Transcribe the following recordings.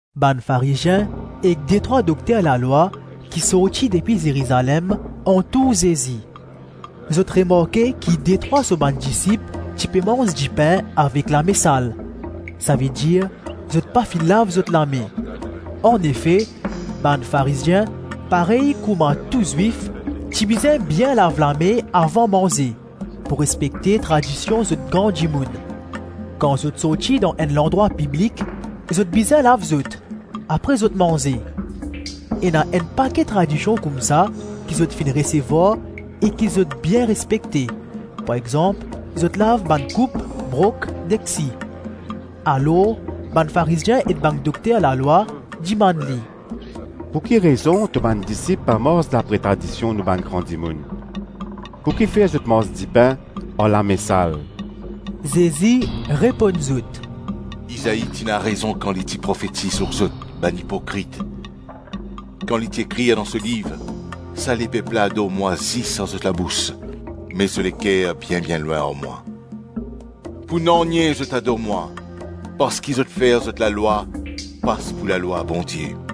Bann Farizien ek detrwa dokter lalwa ki sorti depi Zerizalem antour Zezi. Zot remarke ki detrwa so bann disip ti pe manz dipin avek lame sal, savedir, zot pa finn lav zot lame. Anefe, bann Farizien parey kouma tou Zwif, ti bizin bien lav lame avan manze, pou respekte tradision zot gran dimoun. Kan zot sorti dan enn landrwa piblik, zot bizin lav zot, apre zot manze. Ena enn pake tradision koumsa ki zot finn resevwar e ki zot bien respekte, par exanp zot lav bann koup, brok, deksi. Alors bann Farizien ek bann dokter lalwa dimann li, “Pou ki rezon to bann disip pa mars dapre tradision nou bann gran dimoun? Pou kifer zot manz dipin ar lame sal?” Zezi reponn zot, “Izai ti ena rezon kan li ti profetiz lor zot, bann ipokrit, kan li ti ekrir dan so liv, ‘Sa lepep la ador mwa zis ar so labous me so leker bien-bien lwin ar mwa. Pou nanye zot ador mwa parski zot fer zot lalwa pas pou lalwa Bondie.’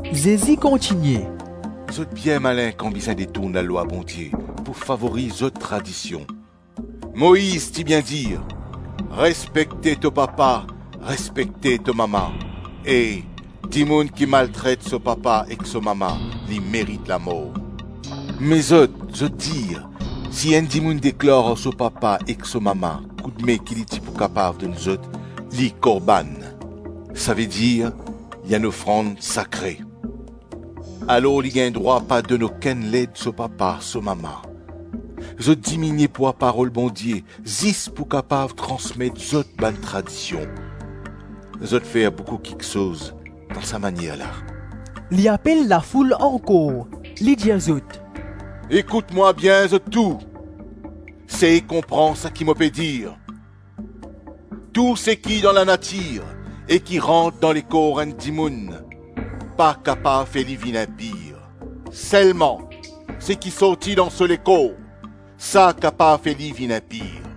Zezi kontigne, “Zot bien malin kan bizin detourn lalwa Bondie pou favoriz zot tradision. Moiz ti bien dir, ‘Respekte to papa, respekte to mama,’ e ‘Dimoun ki maltret so papa, ek so mama, li merit lamor.’ Me zot, zot dir, si enn dimoun deklar ar so papa ek so mama, koudme ki li ti pou kapav donn zot, li Korbann - savedir li enn ofrand sakre, alors li gagn drwa pa donn okenn led so papa, so mama. Zot diminie pwa Parol Bondie zis pou kapav transmet zot bann tradision; zot fer boukou kiksoz dan sa manier la.” Li apel lafoul ankor, li dir zot, “Ekout mwa bien zot tou, sey konpran sa ki mo pe dir. Tou seki dan lanatir e ki rant dan lekor enn dimoun, pa kapav fer li vinn inpir, selman seki sorti dan so lekor, sa kapav fer li vinn inpir. [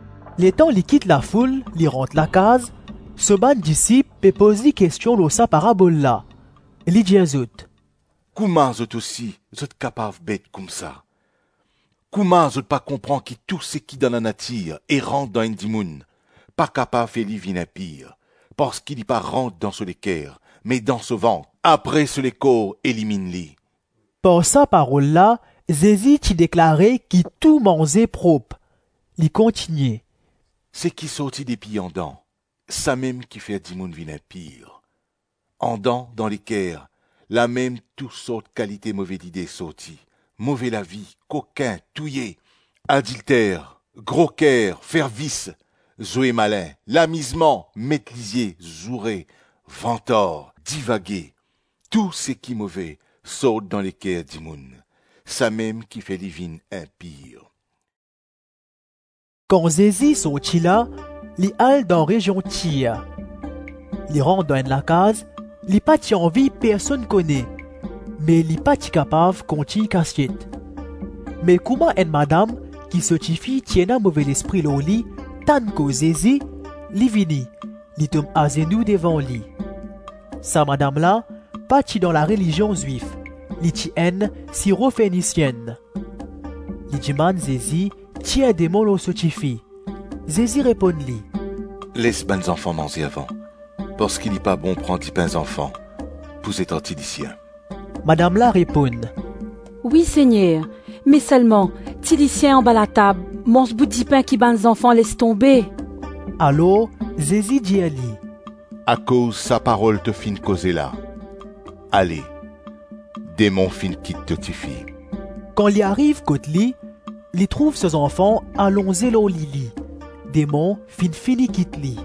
Letan li kit lafoul, li rant lakaz, so bann disip pe poz li kestion lor sa parabol la. Li dir zot, “Kouma zot ousi, zot kapav bet koumsa? Kouma zot pa konpran ki tou seki dan lanatir e rant dan enn dimoun pa kapav fer li vinn inpir, parski li pa rant dan so leker me dan so vant apre so lekor eliminn li?” Par sa parol la Zezi ti deklare ki tou manze prop. Li kontigne, “Seki sorti depi andan, samem ki fer dimoun vinn inpir. Andan, dan leker, lamem tousort kalite move lide sorti: move lavi, kokin, touye, adilter, groker, fer vis, zwe malin, lamizman, met lizie, zoure, vantar, divage. Tou seki move sort dan leker dimoun; samem ki fer li vinn inpir.” Kan Zezi sorti la, li al dan rezion Tir. Li rant dan enn lakaz, li pa ti anvi personn kone, me li pa ti kapav kontign kasiet. Me kouma enn madam ki so tifi ti ena move lespri lor li tann koz Zezi, li vini, li tom azenou devan li. Sa madam la pa ti dan larelizion Zwif; li ti enn Siro-Fenisyenn. Li dimann Zezi tir demon lor so tifi. Zezi reponn li, “Les bann zanfan manze avan, parski li pa bon pran dipin zanfan pou zet ar tilisien.” Madam la reponn, “Wi Segner, me selman tilisien anba latab, manz bout dipin ki bann zanfan les tonbe.” Alor Zezi dir li, “Akoz sa parol to finn koze la, ale, demon finn kit to tifi.” Kan li ariv kot li, li trouv so zanfan alonze lor lili, demon finn fini kit li.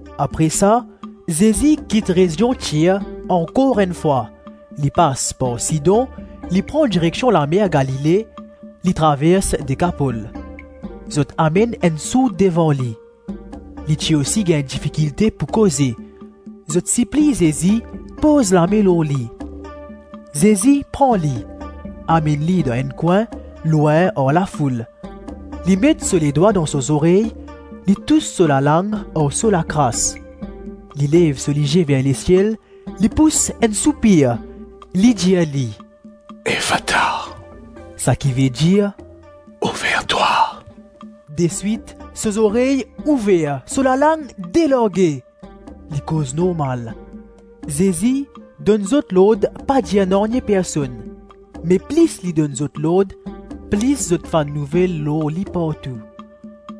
Apre sa, Zezi kit rezion Tir ankor enn fwa, li pas par Sidon; li pran direksion lamer Galile, li travers Dekapol. Zot amenn enn sourd devan li, li ti osi gagn difikilte pou koze; zot sipliy Zezi poz lame lor li. Zezi pran li, amenn li dan enn kwin, lwin ar lafoul. Li met so ledwa dan so zorey; li tous so lalang ar so lakras. Li lev so lizie ver lesiel li pous enn soupir, li dir li “Efata!” -sakivedir, “Ouver-twa!” Deswit so zorey ouver, so lalang delarge, li koz normal. Zezi donn zot lord pa dir nanye personn; me plis li donn zot lord, plis zot fann nouvel lor li partou.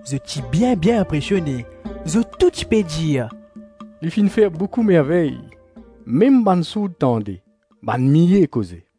Zot ti bien-bien inpresione; zot tou ti pe dir, “Li finn fer boukou mervey! Mem bann sourd tande, bann miye koze.”